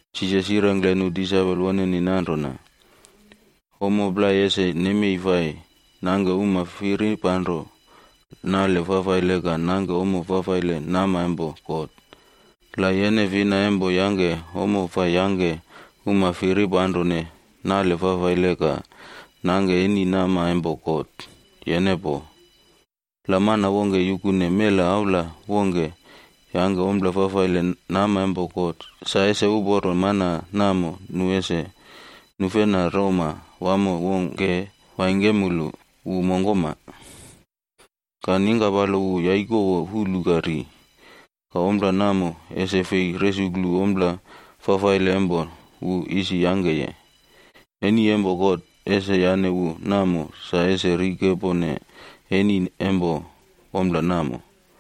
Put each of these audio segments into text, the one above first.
Jisas yirengkle nu disaipol woneni nanrona, “Ommo plai ese nemei fai nangke uma firipanro nale fafaile ka nangke ommo fafaile nama empo God. La yene fina empo yangke ommo fai yangke uma firipanrone nale fafaile ka nangke eni nama empo God, yene poo. La mana wongke yukune mela aula wongke yangke ompla fafaile nama empo God, sa ese uporo mana namo nu ese nufena roma wamo wongke waingkemulu wu mongkoma, ka ningkapalo wu yaikowo fulu ka ri. Ka ompla namo, ese fei resuklu ompla fafaile empo wu isi yangkeye. Eni empo God ese yane wu namo sa ese rikepone eni empo ompla namo.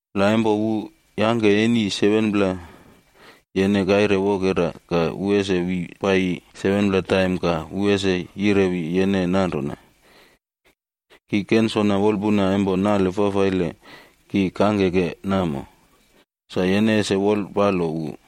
La empo wu yangke nale fafaile yene resuklu 7pla taim empo kaire wokera, ka wu ese wi paiyi 7pla taim ka wu ese yirewi yene nanrona, ‘Ki kensona wolpuna empo nale fafaile isi ki kangkeke namo,’ sa yene ese yupone nale fafaile wunini.”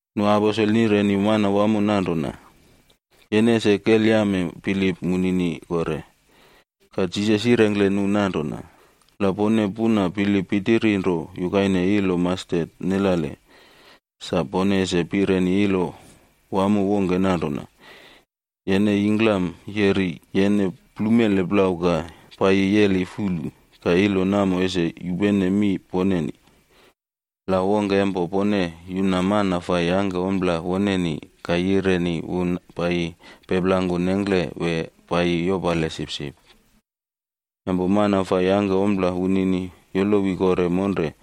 Nu aposel nireni Manawamo nanrona, “Yene ese kelyame bilip munini kore.” Ka Jisas yirengkle nu nanrona, “La pone puna bilip pitiri nro yukaine ilo mastet nelale,a sa pone ese pireni ilo wamo wongke nanrona, ‘Yene yingklam yeri yene plumele plau ka paiyi yeli fulu.’ Ka ilo namo ese yupene mi poneni. “La wongke empo pone yuna mana fai yangke ompla woneni ka yireni wu paiyi peplangku nengkle wee paiyi yopale sipsip, empo mana fai yangke ommo wunini yolowi kore monre,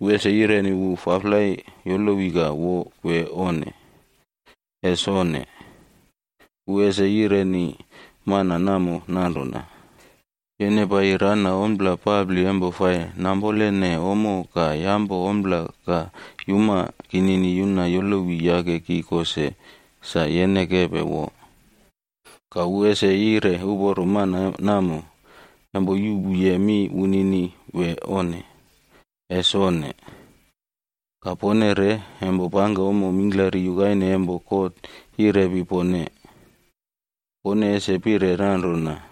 wu ese yireni wu ‘Faflai yolowi ka wo’ wee onne? Ese onne! Wu ese yireni mana namo nanrona, ‘Yene paiyi rana ompla papli empo fai nampolene ommo ka yampo ompla ka yuma kinini yuna yolowi yake ki ko se, sa yene kepe wo.’ Ka wu ese yire uporo mana fai yangke ommo namo empo yupene mi wunini wee onne? Ese onne! Ka pone re, empo pangke ommo mingklari yukaine empo God yirepi pone, pone ese pire nanrona,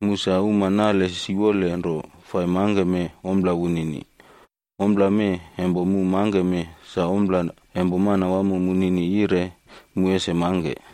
‘Mu sa uma nale siwole nro fai mangkeme ompla wunini. Ompla mee empo mu mangkeme, sa ompla empo Manwamo munini yire mu ese mangke.’”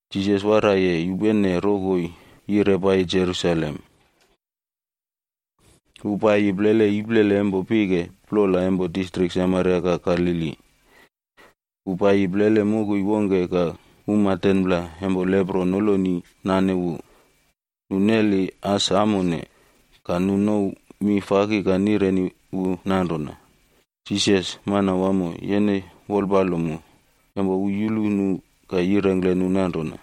Jisas waraiye yupene rokoi yire paiyi Jerusalem. Wu paiyi plele iplele empo pike plola empo distrik Samaria ka Galili. Wu paiyi plele mokoi wongke ka uma 10pla empo lepro noloni nane wu. Nu neli as amone. Ka nu nouw mi faki ka nireni wu nanrona, “Jisas, Manwamo, yene wolpalo mu.” Empo wu yulu nu ka yirengkle nu nanrona,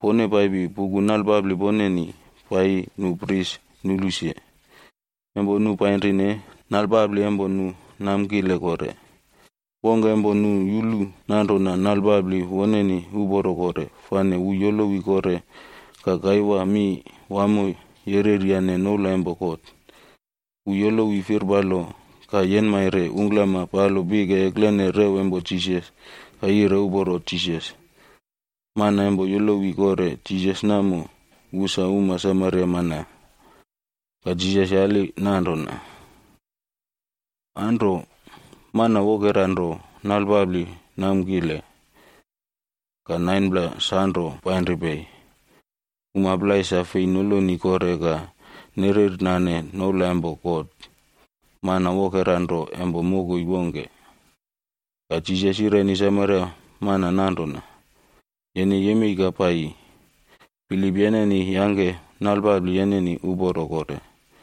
“Pone paipi puku nalpapli poneni paiyi nu pris nulu se.”b Empo nu painrine, nalpapli empo nu namkile kore. Wongke empo nu yulu nanrona nalpapli woneni uporo kore, fane wu yolowi kore ka kaiwa mi wamo yereryane noula empo God. Wu yolowi firpalo ka yenmaire ungklama palo pike eklene rew empo Jisas ka yire uporo Jisas. Mana empo yolowi kore Jisas namo wu sa uma Samaria mana. Ka Jisas yali nanrona, “Anro, mana wokera nro nalpapli namkile? Ka 9pla sanro painri pei? Uma plai sa fei noloni kore ka nerernane noula empo God. Mana wokera nro empo mokoi wongke.” Ka Jisas yireni Samaria mana nanrona, “Yene yemei ka paiyi, bilip yeneni yangke nalpapli yeneni uporo kore.”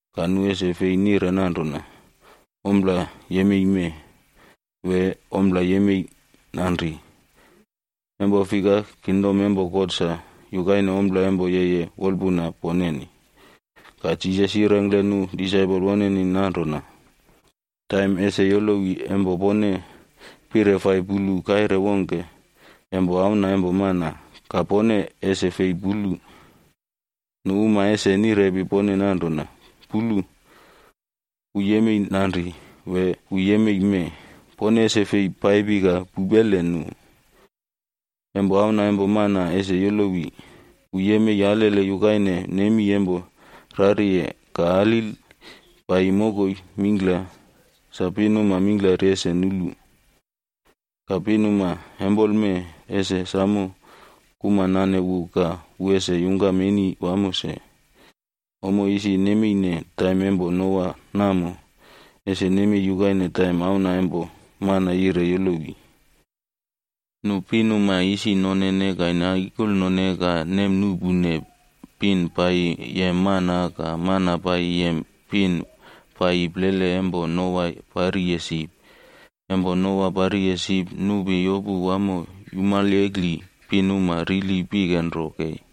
Ka nu ese fei nire nanrona, ‘Ompla yemei mee,’ wee ‘Ompla yemei nanri,’ empo fika kingdom empo God sa yukaine ompla empo yeye wolpuna poneni.” Ka Jisas yirengkle nu disaipol woneni nanrona, “Taim ese yolowi empo pone pire fai pulu kaire wongke empo Auna empo Mana. Ka pone ese fei pulu. Nu uma ese nirepi pone nanrona, ‘Pulu. Wu yemei nanri!’ wee ‘Wu yemei mee!’ Pone ese fei paipi ka pupele nu. Empo Auna empo Mana ese yolowi, wu yemei alele yukaine nemi empo rariye ka alil paiyi mokoi mingkla sa pinuma mingklari ese nulu. Ka pinuma empoleme ese samo kuma nane wu ka wu ese yungkam eni wamo se. “Ommo isi nemeine taim empo Noa namo, ese nemei yukaine taim Auna empo Mana yire yolowi. Nu pinuma isi nonene ka naikolnone ka nemnuꞌpune, pin paiyi yem mana ka mana paiyi yem pin paiyi plele empo Noa pariye sip. Empo Noa pariye sip, nupi yopu wamo yumalyekli pinuma rili pike nro kei.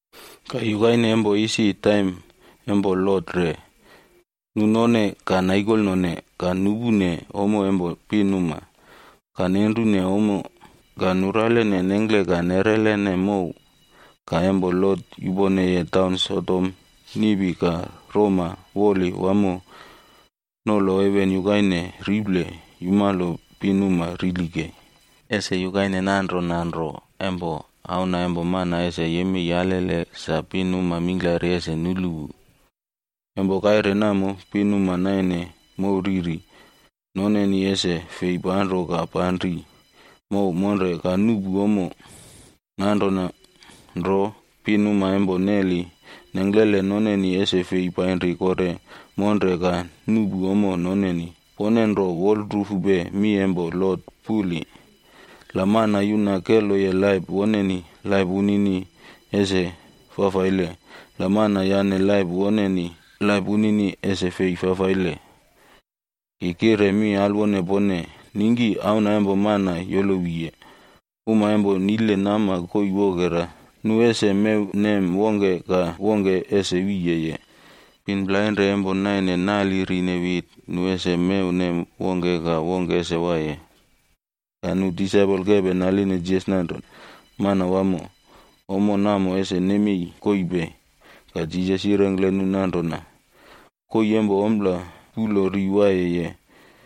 “Ka yukaine empo isi taim empo Lot re.c Nu none, ka naikolnone, ka nuꞌpune ommo empo pinuma, ka nenrune ommo, ka nuralene nengkle ka neꞌrelene mow. Ka empo Lot yuponeye taun Sodom, niꞌpi ka roma woli wamo nolo heven yukaine riple yumalo pinuma rili kei. “Ese yukaine nanrona nro empo Auna empo Mana ese yemei alele sa pinuma mingklari ese nulu wu. Empo kaire namo, pinuma nainene mow ririd noneni ese fei panro ka panri mow monre ka nuꞌpu ommo. Nanrona nro, pinuma empo neli nengklele noneni ese fei painri kore monre ka nuꞌpu ommo noneni. Pone ro wolrufupe mi empo Lot puli!e La mana yuna keloye laip woneni, laip wunini ese fafaile. La mana yane laip woneni, laip wunini ese fei fafaile. “Ki kire mi alwone pone, ningki Auna empo Mana yolowiye, mana plainrane empo niye nama koii wokera, nu ese mewnem wongke ka wongke ese wiyeye. Pin plainrane empo naine nalirine wit, nu ese mewnem wongke ka wongke ese waiye.” Ka nu disaipol kepe naline Jisas nanrona, “Manwamo, ommo namo ese nemei koii pei?” Ka Jisas yirengkle nu nanrona, “Koii empo ompla puꞌlo ri waiyeye,